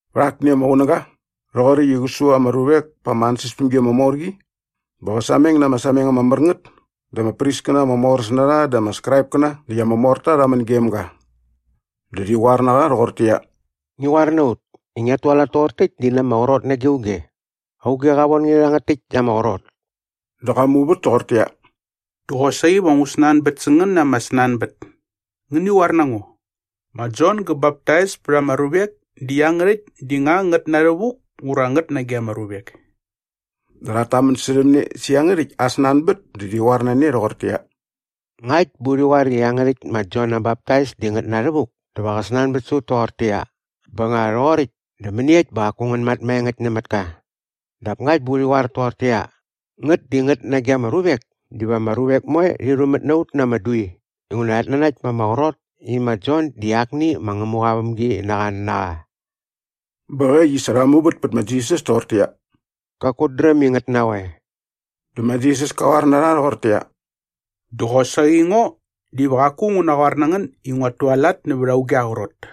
Vät akni ama qunäga rhoqoräkt i qä su ama ruvek pa ama ansäspämgi ama mor qi bä qä sameng na ama sameng ama mär ngät dä ama priskäna ama moräs na rha dä ama Skraipkäna näkt ama morta rha män gem ga. Dä rhi qoar na qa rhoqortäqyia, “Ngi qoar na ut i ngiat tualat toqor täkt di na ama qrot nage auge. Auge qa von nge rhä rhangät täkt ama qrot?” Dä qa muvät toqortäqyia, “Dä qosaqi va ngu snanbät sä ngän na ama snanbät. Ngäni qoar na ngo. Ma Jon gä baptais pät ama ruvek di iangärhäkt di nga ngät na rhävuk ura ngät nage ama ruvek?” Dä rhat tamän särhäm ne sä iangärhäkt aa snanbät dä rhi qoar na ne rhoqortäqyia, “Ngakt bä urhi qoar i iangärhäkt ma Jon aa baptais di ngät na rhävuk dä va qä snanbät sä ut toqortäqyia, ‘Bä nga rhoqoräkt dä mäniekt bä qaku ngän mat maengäkt nämät ka?’ Dap ngakt bä urhi qoar toqortäqyia, ‘ngät di ngät nage ama ruvek’ diva ama ruvek moe rhi rhumät nä ut na ama dui inguna rhat nanakt ma ama qrot i ma Jon di akni ma Ngämuqa aa vämginaqa na qa.” Bä äkt i sa rha muvät pät ma Jisas toqortäqyia, “Qaku ut dräm i ngät na qoe.” Dä ma Jisas ka qoar na rha rhoqortäqyia, “Dä qosaqi ngo diva qaku ngu naqoar na ngän i nguat tualat nävät auge aa qrot.”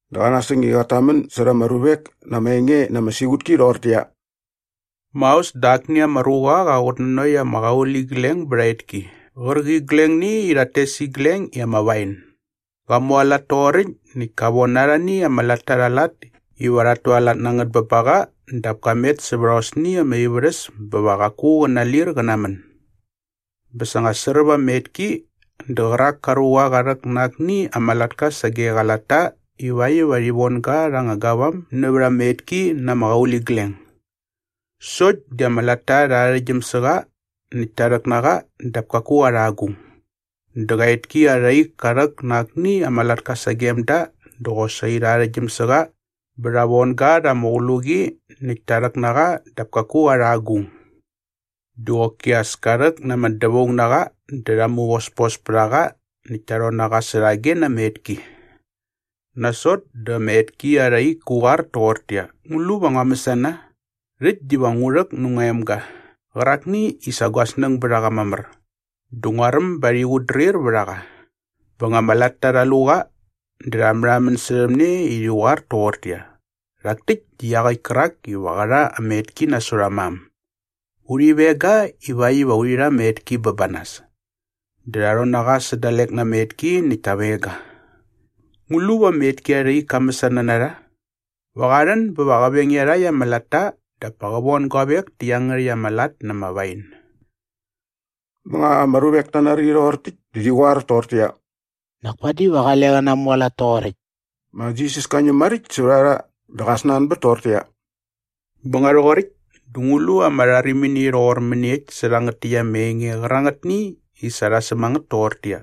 Dä qa nasäng i qat tamän särha ama ruvek na ama enge na ama siqutki rhoqortäqyia, “Maos dä akni ama ruqa qa qutnanokt ama qauligleng bät aa etki qärqiglengni i rhat tes igleng i ama wain. Qa mualat toqoräkt näkt ka von arhani ama latta rha aa lat iva rhat tualat na ngät bä ba qa dap ka met sävät aosni ama ivärhäs bä va qaku qä nalir qä namän. Bä sa nga sräp ama etki dä qärak ka ruqa qa rhäk na akni ama latka sage qa latta ivakt iva rhi von ga rha anga gavam nävät ama etki na ama qauligleng. Sokt di ama latta rha arhäktgyäm sä qa näkt ta rhäk na qa dap kaku qa rha agung. Dä qa etki arha ik ka rhäk na akni ama latka sagem da dä qosaqi rha arhäktgyäm sä qa bä rha von ga rha ama qluqi näkt ta rhäk na qa dap kaku qa rha agung. Dä qoki as ka rhäk na ama dävaung na qa dä rha muvospos pät a qa näkt ta rhon na qa särhage na ama etki.” “Nasot dä ama etki arha ik kä qoar toqortäqyia, ‘Ngu lu va ngua mäsana? Rhäkt diva ngu rhäk nä ngua emga qärakni i sa gua snäng bät a qa mamär dä nguaräm ba rhi qutdrir vät a qa.’” “Bä nga ama latta rha lu qa dä rha märhamän särhäm ne i rhi qoar toqortäqyia, ‘Rhak täkt di iaqäkt kärak iva qä rha ama etki nasot aa mam. Urhi veng ga ivakt iva urhi rha ama etki bä ba nas.’ Dä rha rhon na qa sä dalek na ama etki näkt ta veng ga.” “Ngu lu va ama etki arha ik ka mäsana na rha? Va qa rhän bä va qä veng iarhakt ama latta dap pa qä von guavek tä iangärhäkt ama lat na ama wain.” Bä nga ama ruvek ta nari rhoqor täkt dä rhi qoar toqortäqyia, “Nak padi va qale qä namualat toqoräkt.” Ma Jisas ka ñäm maräkt sävät a rha dä qa snanbät toqortäqyia, “Bä nga rhoqoräkt dä ngu lu ama rharimini rhoqor mäniekt sä rhangät täkt ama enge qärangätni i sa rha säm a ngät toqortäqyia,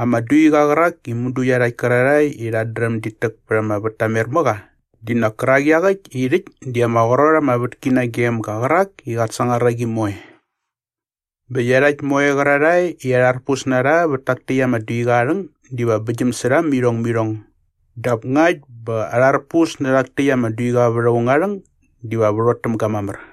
“‘Ama duiqa qärak i mudu iarhakt kärarhae i rhat dräm dit täk pät ama vät ta mer mä qa di nak kärak iaqäkt i rhäkt di ama qrot ama vätki nagem ga qärak i qat sangar a qi moe’? Bä iarhakt moe qärarhae i arharpus na rha vät tak täkt ama duiqa aa rhäng diva bäktgyäm sä rha mä irhong mä irhong dap ngakt bä arharpus nä rhak täkt ama duiqa vät aung aa rhäng diva värhot täm ga mamär.”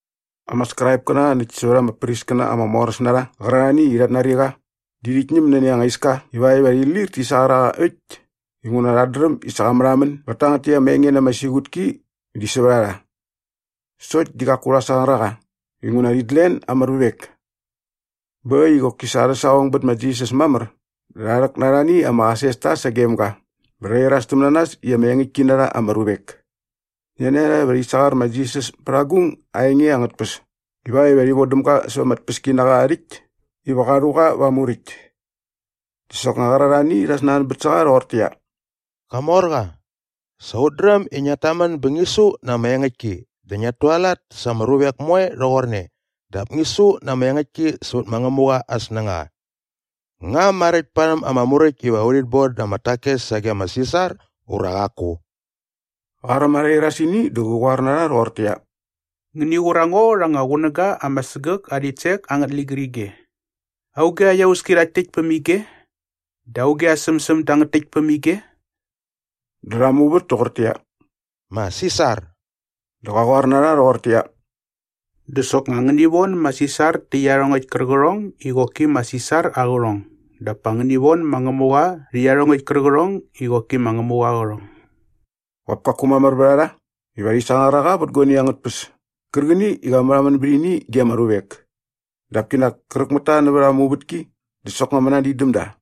Ama Skraipkäna näkt sävät ama priskäna ama moräs na rha qärarhani i rhat nari qa di rhit ñäm nani anga iska ivakt iva rhi lir ti sangar a qa äkt inguna rhat dräm i sa qa märhamän bät tangät täkt ama enge na ama siqutki di sävät a rha. Sokt di qaku rha sangar a qa inguna rhit len ama ruvek. Bä äkt i qoki sa arhä saqong bät ma Jisas mamär dä rha rhäk na arhani ama qasesta sagem ga bä rha irastäm na nas i ama engäktki na rha ama ruvek. Nani a rha iva rhi sangar ma Jisas pät agung aa enge angät tpäs ivakt iva rhi vodäm ga säva ama tpäskinaqa aa rhäkt iva qa rhu qa va aa muräkt. Dä soknga qärarhani rha snanbät sä qa rhoqortäqyia, “Qamorqa, sa ut dräm i ngiat tamän bä ngi su na ama engäktki dä ngiat tualat sa ama ruvek moe rhoqorne dap ngi su na ama engäktki sävät ma Ngämuqa aa snängaqa. Nga maräkt parhäm ama Muräkt iva urhit bon da ama takes sage ma Sisar ura qaku?” Qa räm arha irasini dä qä qoar na rha rhoqortäqyia, “Ngäni qur a ngo rha anga qunäga ama sägäk aa rhitsek angät ligärige. Auge aa iauski rhakt täkt päm ige? Dä auge aa sämsäm dangät täkt päm ige?” Dä rha muvät toqortäqyia, “Ma Sisar.” Dä qa qoar na rha rhoqortäqyia, “Dä soknga ngäni von ma Sisar tä iarhongäkt kärqärhong i qoki ma Sisar aa qärhong dap pa ngäni von ma Ngämuqa rhä iarhongäkt kärqärhong i qoki ma Ngämuqa aa qärhong.” Qop kaku mamär vät a rha iva rhi sangar a qa vät guani angät tpäs kärqäni i qa märhamän bät ini ge ama ruvek. Dap kinak kräk mät ta nävät aa muvätki dä soknga mänadin däm da.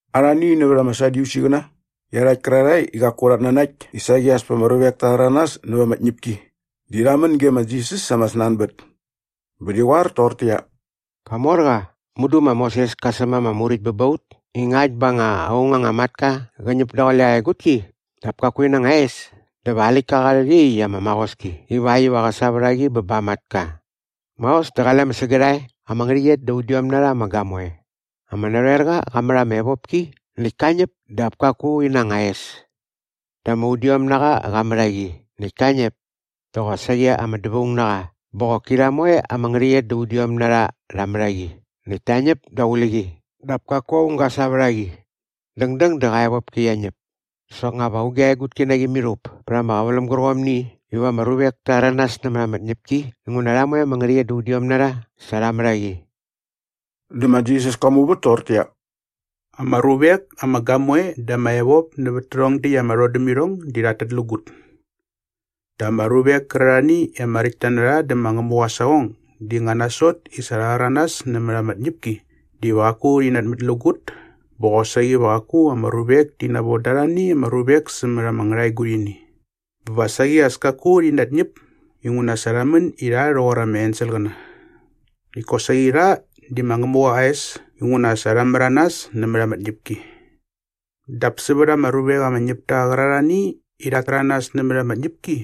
Arhani nävät ama Sadyusiqäna iarhakt kärarhae i qaku rhat nanakt i saqi as pa ama ruvek ta rhäranas näva ama tñäpki di rha män ge ma Jisas sa ama snanbät. Bä rhi qoar toqortäqyia, “Qamorqa! Mudu ma Moses ka säm ama muräkt bä ba ut i ngakt bä nga aung anga matka qä ñäp daqule aa egutki dap kaku ina anga es dä va aa läktka qa rhät iaqyäkt ama maqoski ivakt iva qä sa vät a qi bä ba aa matka. “Maos dä qale ama sägärhae ama ngärhäqyet da udiom na rha ama gamoe. Ama narhoerqa qa mät ama evopki näkt ka ñäp dap kaku ina anga es. Dä ama udiomnaqa qa mät a qi näkt ka ñäp dä qosaqi ama dävaungnaqa bä qoki rha moe ama ngärhäqyet da udiom na rha rha mät a qi näkt ta ñäp daqule qi dap kaku aung ga sa vät a qi. Dängdäng dä qa evopki qia ñäp. Dä soknga va auge aa egutki na qi mirhup pät ama qäväläm gärqomni iva ama ruvek ta rhäranas nämät ama tñäpki inguna rha moe ama ngärhäqyet da udiom na rha sa rha mät a qi?” Dä ma Jisas ka muvät toqortäqyia, “Ama ruvek ama gamoe dä ama evop nävät tärhong däkt ama rhodämirhong di rhat tätlägut. Dap ama ruvek kärarhani i ama räkt ta dä ma Ngämuqa aa saqong di nga nasot i sa rha rhäranas nämät ama tñäpki diva qaku rhi natmätlägut bä qosaqi va qaku ama ruvek ti navon da arhani ama ruvek sämät ama ngärhaegurhini. Bä va saqi as kaku rhi natñäp inguna sa rha män i rha rhoqor ama enselqäna. Näkt kosaqi rha di ma Ngämuqa aa es inguna sa rha märanas nämät ama tñäpki. “Dap sävät ama ruvek ama ñäp ta qärarhani i rhat täranas nämät ama tñäpki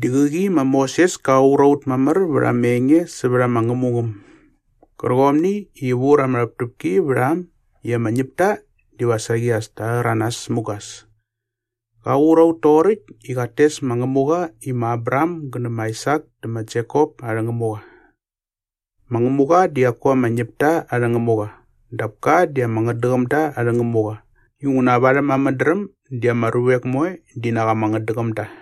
di qäqi ma Moses ka qur a ut mamär vät ama enge sävät ama ngämungäm gärqomni i vur ama rhäptäpki vät a äm i ama ñäpta diva saqi as ta rhäranas mugas. Qa qur a ut toqoräkt i qat tes ma Ngämuqa i ma Abraham gä nä ma Aisak dä ma Jekop arhä Ngämuqa. Ma Ngämuqa di qaku ama ñäpta arhä Ngämuqa dap ka di ama ngätdäqämda arhä Ngämuqa inguna varhäm aa mädräm di ama ruvek moe di nak ama ngätdäqäm da.”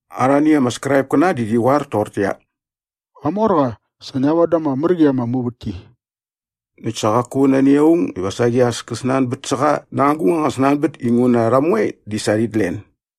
Arhani ama Skraipkäna di rhi qoar toqortäqyia, “Qamorqa, sa ngia voda ama mär qi ama muvätki.” Näkt sa qaku nani aung iva saqi as kä snanbät sä qa na agung anga snanbät inguna rha moe di sa rhit len.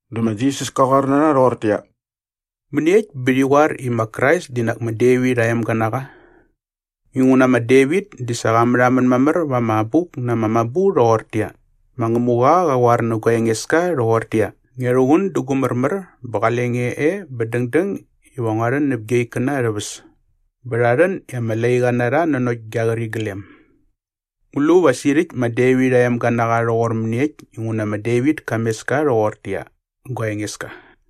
Dä ma Jisas ka qoar na rha rhoqortäqyia, “Mäniekt bä rhi qoar i ma Krais di nak ma Devit aa emga na qa? Inguna ma Devit di sa qa märhamän mamär va ama Abuk na ama Mabu rhoqortäqyia, “‘Ma Ngämuqa qa qoar nä gua Engeska rhoqortäqyia, “Ngia rhuqun dä gu märmär bä qale nge e bä dängdäng iva ngua rhän näp gia ikkäna arhä väs bä rha rhän i ama laiqa na rha nanokt gia qäriglem.” ’ Ngu lu va sirhäkt ma Devit aa emga na qa rhoqor mäniekt inguna ma Devit ka mes ka rhoqortäqyia, ‘Gua Engeska’?”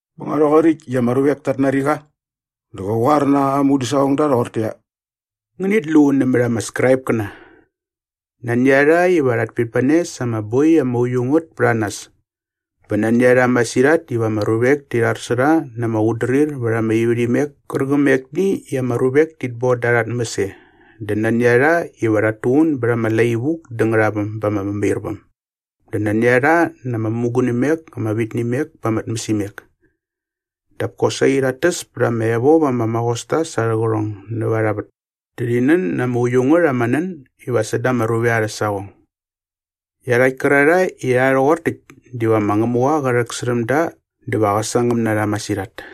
Bä nga rhoqoräkt i ama ruvek tat nari qa dä qä qoar na aa mudäsaqongda rhoqortäqyia, “Ngänit lu nämät ama Skraipkäna. Nani a rha iva rhat pitmane sa ama boi ama uiu ngät pät a nas bä nani a rha masirhat iva ama ruvek ti rhar sä rha na ama qutdrir vät ama ivärhimek kärqämekni i ama ruvek tit boda arha tmäs e dä nani a rha iva rhat tuqun bät ama lai vuk dä ngärhaväm ba ama mämairväm dä nani a rha na ama mämugunimek ama vit nä imek pa ama tmäsimek. Dap kosaqi rhat täs pät ama evop ama maqosta sa arhä qärhong näva arha vät dä rhi nän na ama uiu ngät ama nän iva säda ama ruvek arhä saqong. Iarhakt kärarhae i rha rhoqor täkt diva ma Ngämuqa qä rhäksärhäm da dä va qä sangäm na rha masirhat.”